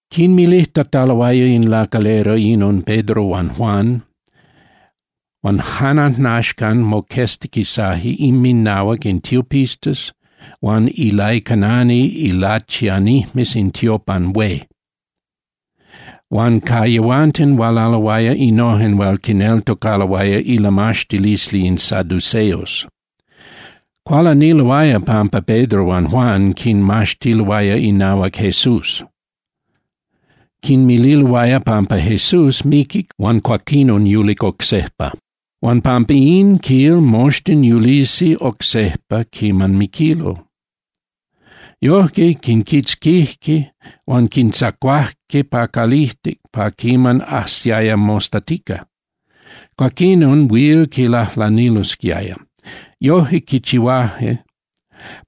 Quinmilijtataloaya in lacalera inon Pedro huan Juan, huan jan ajnaxcan moqueztiquisaje inminahuac in tiopistas huan ilaicanani ilachianijmes in tiopan hué. Huan ca yehuanten hualaloaya innojen hual quineltocaloaya ilamaxtilisli in saduceos. Cualaniloaya pampa Pedro huan Juan quinmaxtiloaya inahuac Jesús. Quinmililoaya pampa Jesús miquic huan cuaquinon yulic oc sejpa. Huan pampa in, quil, moxtin yulisi oc sejpa quiman miquilo. Yojque, quinquitzquijque huan quintzacuajque pa calijtic pa quiman ajsiaya mostatica, cuaquinon huil quinlajlanilosquiaya. Yojque quichihuajque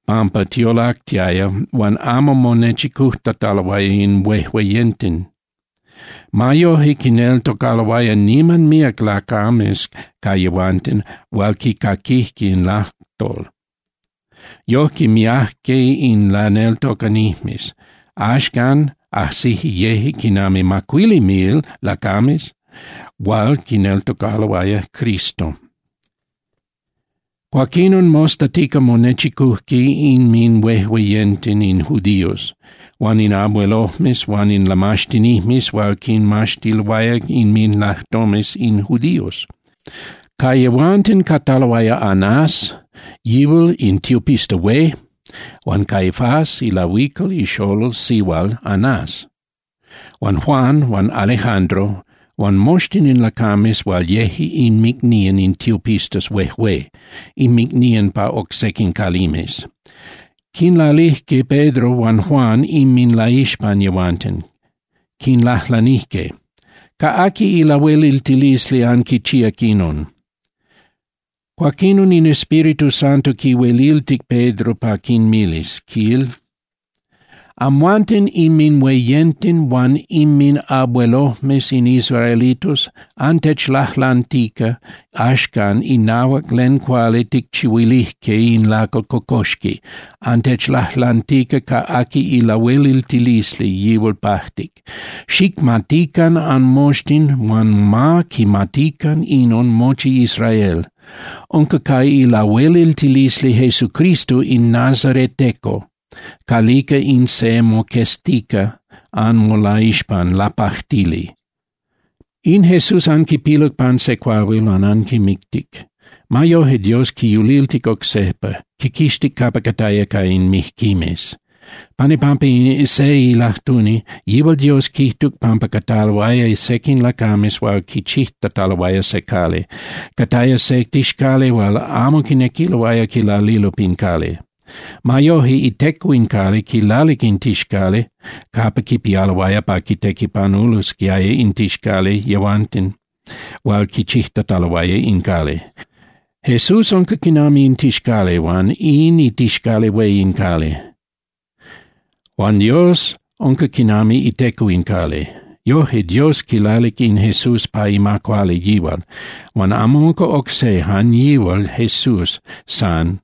pampa tiolactiaya huan amo monechicujtataloaya in huejueyenten. Ma yoje, quineltocaloaya niman míac lacames ca yehuanten hual quicaquijque in lajtol. Yojque miajque in laneltocanijmes. Axcan ajsije yeje quinami macuili mil lacames hual quineltocaloaya Cristo. Cuaquinon mostatica monechicujque inminhuejueyenten in judíos huan in abuelojmes huan in lamaxtinijmes hual quinmaxtiloaya inminlajtomes in judíos. Ca yehuanten cataloaya Anás, yihual in tiopista hué, huan Caifás ilahuical ixolol sihual Anás, huan Juan huan Alejandro huan moxtin in lacames hual yeje inmicnían in tiopistas huejué, inmicnían pa oc sequin calimes. Quinlalijque Pedro huan Juan inminlaixpan yehuanten, quinlajlanijque: —¿Ca aqui ilahueliltilisli anquichíac inon? Cuaquinon in Espíritu Santo quihueliltic Pedro pa quinmilis, quil: —Amhuanten inminhueyenten huan inminabuelojmes in israelitos, antechlajlantica axcan inahuac len cuali ticchihuilijque in lacal cocoxqui, antechlajlantica ca aqui ilahueliltilisli yihual pajtic. Xicmatican anmoxtin huan ma quimatican inon mochi Israel: Unca ca ilahueliltilisli Jesucristo in nazareteco calica in se moqueztica anmolaixpan lapajtili. In Jesús anquipiluc pan se cuahuil huan anquimictic. Ma yoje, Dios quiyuliltic oc sejpa, quiquixtic capa cataya ca in mijquimes. Pan ipampa se ilajtuni, yihual Dios quijtuc pampa cataloaya sequin lacames hual quichijtataloaya se cali. Cataya se tixcali hual amo quinequiloaya quilalilo pin cali. Ma yoje iteco in cali quilalic in tixcali capa quipialoaya pa quitequipanulosquiaya in tixcali yehuanten hual quichijtataloaya in cali. Jesús unca quinami in tixcali, unca in itixcali hué in cali. Huan Dios unca quinami iteco in cali. Yoje, Dios quilalic in Jesús pa ima cuali yihual. Huan amo unca oc se, jan yihual Jesús san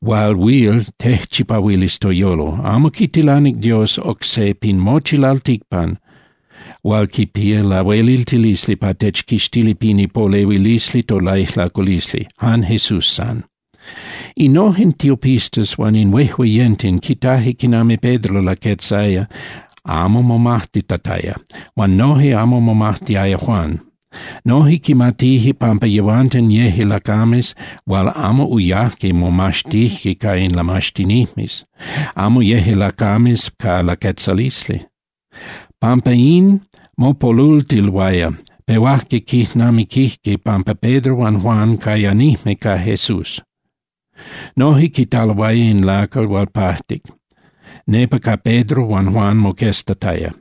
hual huil tejchipahuilis toyolo, amo quitilanic Dios oc se pin mochi lalticpan hual quipía lahueliltilisli pa techquixtilis pin ipolehuilisli tolaijlaculisli, jan Jesús san. Innojen tiopistas huan in huejueyenten quitaje quinami Pedro laquetzaya amo momajtitataya, huan noje amo momajtiaya Juan. Noje quimatije pampa yehuanten yeje lacames hual amo uyajque momaxtijque ca in lamaxtinijmes, amo yeje lacames ca laquetzalisli. Pampa in, mopolultiloaya, pehuajque quijnamiquijque pampa Pedro huan Juan cayanijme ca Jesús. Noje quitaloaya in lacal hual pajtic, nepa ca Pedro huan Juan moqueztataya.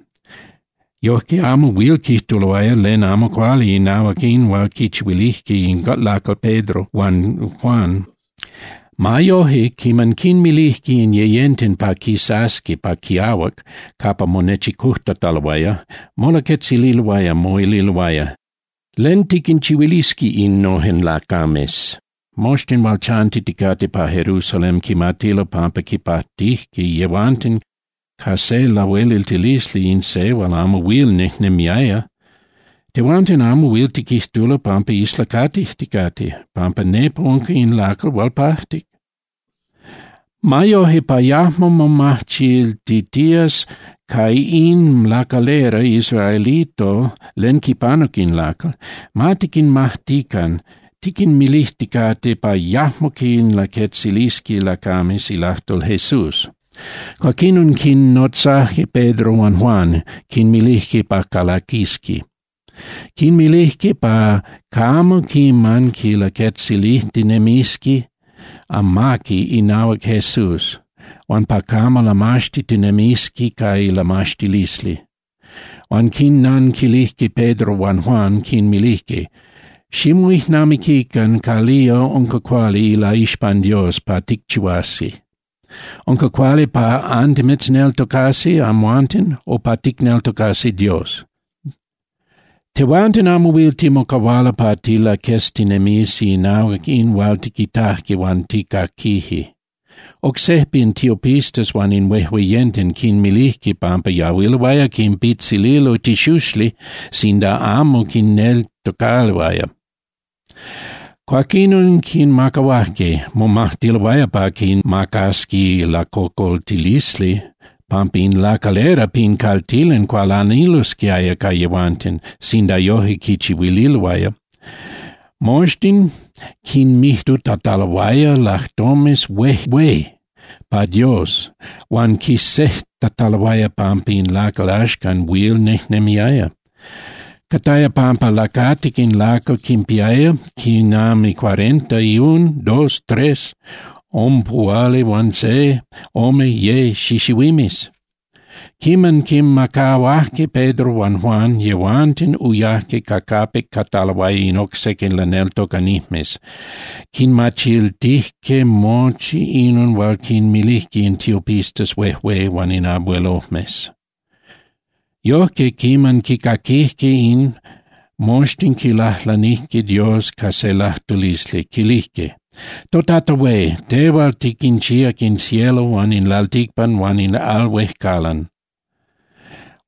Yojque amo huil quijtuloaya len amo cuali inahuac in hual quichihuilijque in lacal Pedro huan Juan. Ma yoje, quiman quinmilijque in yeyenten pa quisasqui pa quiahuac capa monechicujtataloaya, molaquetzililoaya, moililoaya: —¿Len tiquinchihuilisqui innojen lacames? Moxtin hual chantiticate pa Jerusalén quimatilo pampa quipajtijque yehuanten ca se lahueliltilisli in se hual amo huil nejnemiaya. Tehuanten amo huil tiquijtulo pampa islacatijticate, pampa nepa unca in lacal hual pajtic. Ma yoje, pa yajmo momachiltitías ca in lacalera israelito len quipanuc in lacal, ma tiquinmajtican tiquinmilijticate pa yajmo quinlaquetzilisqui lacames ilajtol Jesús. Cuaquinon quinnotzajque Pedro huan Juan, quinmilijque pa calaquisqui. Quinmilijque pa camo quiman quilaquetzilijtinemisqui amaqui inahuac Jesús, huan pa camo lamaxtitinemisqui ca ilamaxtilisli. Huan quinnanquilijque Pedro huan Juan, quinmilijque: —Ximoijnamiquican calía unca cuali ilaixpan Dios pa ticchihuasi. ¿Unca cuali pa antimitzneltocasi amhuanten o pa ticneltocasi Dios? Tehuanten amo huil timocahualo pa tilaqueztinemisi inahuac in hual tiquitajque huan tijcaquije. Oc sejpa in tiopistas huan in huejueyenten quinmilijque pampa yahuiloaya quinpitzililo tixuxli sinda amo quinneltocaloaya. Cuaquinon quinmacahuajque. Momajtiloaya pa quinmacasqui lacocoltilisli pampa in lacalera pin caltilan cualanilosquiaya ca yehuanten sinda yoje quinchihuililoaya. Moxtin quinmijtutataloaya lajtomes huejué pa Dios huan quisejtataloaya pampa in lacal axcan huil nejnemiaya. Cataya pampa lacatic in lacal quinpiaya quinami cuarenta y un, dos, tres (ompuhualihuanse, ome, ye) xixihuimes. Quiman quinmacahuajque Pedro huan Juan, yehuanten uyajque ca capic cataloaya in oc sequin laneltocanijmes, quinmachiltijque mochi inon hual quinmilijque in tiopistas huejué huan in abuelojmes. Yojque, quiman quicaquijque in, moxtin quilajlanijque Dios ca se lajtulisli, quilijque: —ToTata hué, tehual tiquinchíac in cielo huan in lalticpan huan in al huejcalan.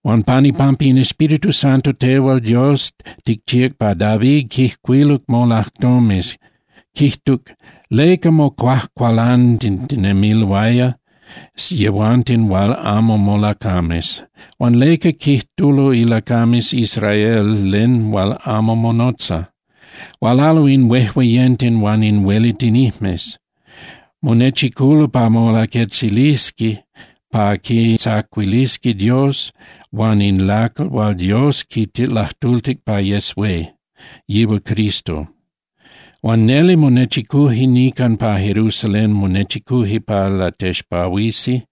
Huan pan ipampa in Espíritu Santo, tehual Dios ticchíac pa David quijcuiluc molajtomes, quijtuc: ¿Leca mocuajcualantitinemiloaya yehuanten hual amo molacames? Huan ¿leca quijtulo ilacames Israel len hual amo monotza? Hualalo in huejueyenten huan in huelitinijmes, monechiculo pa molaquetzilisqui pa quintzacuilisqui Dios huan in lacal hual Dios quilajtultic pa yes hué, yihual Cristo. Huan neli monechicuje nican pa Jerusalén, monechicuje pa latexpahuisi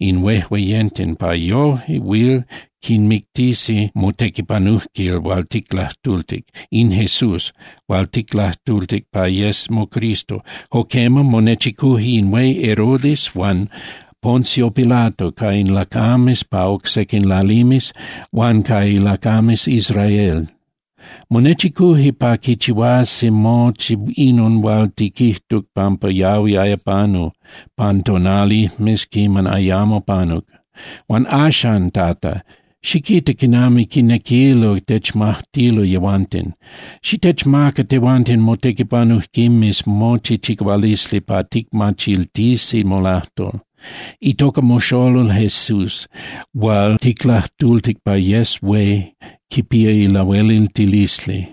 in huejueyenten pa yoje huil quimictisi motequipanujquil hual ticlajtultic, in Jesús hual ticlajtultic pa yes moCristo. Jo quema, monechicuje in hué Herodes huan Poncio Pilato ca in lacames pa oc sequin lalimes huan ca ilacames Israel. Monechicuje pa quichihuasi mochi inon hual tiquijtuc pampa yahuiaya panu pan tonalijmes quiman ayamo panuc. Huan axan, Tata, xiquita quinami quinequilo techmajtilo yehuanten. Xitechmaca tehuanten motequipanujquimes mochi chicahualisli pa ticmachiltisi molajtol. Itoca moXolol Jesús hual ticlajtultic pa yes hué quipía lahueliltilisli.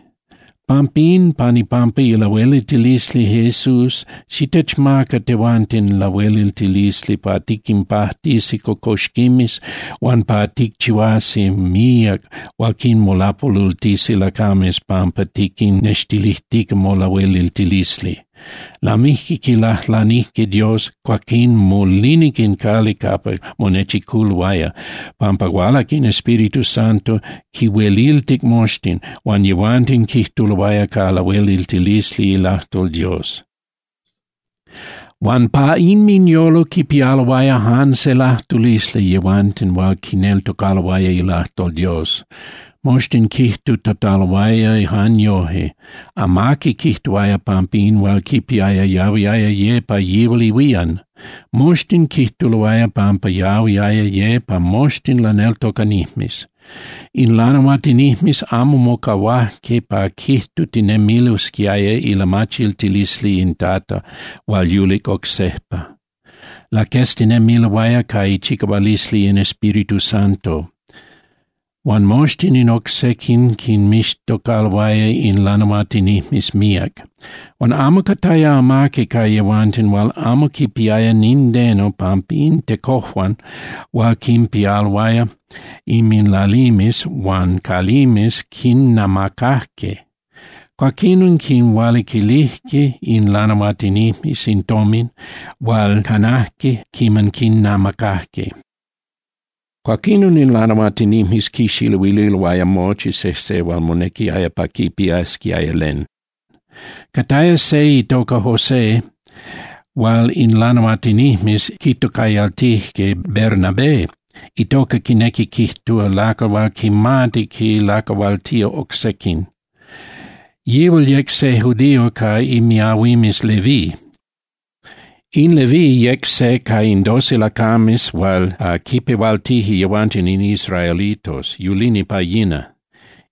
Pampín pan ipampa ilahueliltilisli Jesús xitechmaca tehuanten lahueliltilisli pa tiquinpajtisi cocoxquimes, huan pa ticchihuasi míac hual quinmolapolultisi lacames pampa tiquinnextilijtica molahueliltilisli. Lamijque quilajlanijque Dios, cuaquín molinic in cali capa monechiculoaya, pampa hualac in Espíritu Santo, quinhueliltic moxtin, huan yehuanten quijtuloaya ca lahueliltilisli ilajtol Dios. Huan pa inminyolo quipialoaya jan se lajtulisli yehuanten hual quineltocaloaya ilajtol Dios. Moxtin quijtutataloaya jan yoje, amaqui quijtuaya pampa in hual quipiaya yahuiaya ye pa yihual ihuían. Moxtin quijtuloaya pampa yahuiaya ye pa moxtin laneltocanijmes. In lanahuatinijmes amo mocahuajque pa quijtutinemilosquiaya ilamachiltilisli in Tata hual yulic oc sejpa. Laqueztinemiloaya ca ichicahualisli in Espíritu Santo. Huan moxtin in oc sequin quinmixtocaloaya in lanahuatinijmes míac. Huan amo cataya amaqui ca yehuanten hual amo quipiaya nindeno, pampa in tecojuan hual quinpialoaya inminlalimes huan calimes quinnamacajque. Cuaquinon quinhualiquilijque in lanahuatinijmes in tomin hual canajque quiman quinnamacajque. Cuaquinon in lanahuatinijmes quixiluililoaya mochi sejse hual monequiaya pa quipiasquiaya len. Cataya se itoca José hual in lanahuatinijmes quitocayaltije Bernabé, itoca quinequi quijtúa lacal hual quimati quinlacahualtía oc sequin. Yihual yec se judío ca imiahuimes Leví. In Leví yec se ca in doce lacames hual quinpehualtije yehuanten in israelitos, yulini pa yina.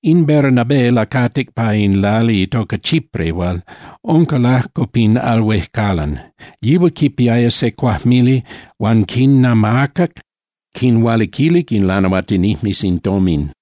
In Bernabé lacatic pa se lali itoca Chipre hual unca lajco pin al huejcalan. Yihual quipiaya se cuajmili huan quinamacac, quinhualiquilic in lanahuatinijmes in tomin.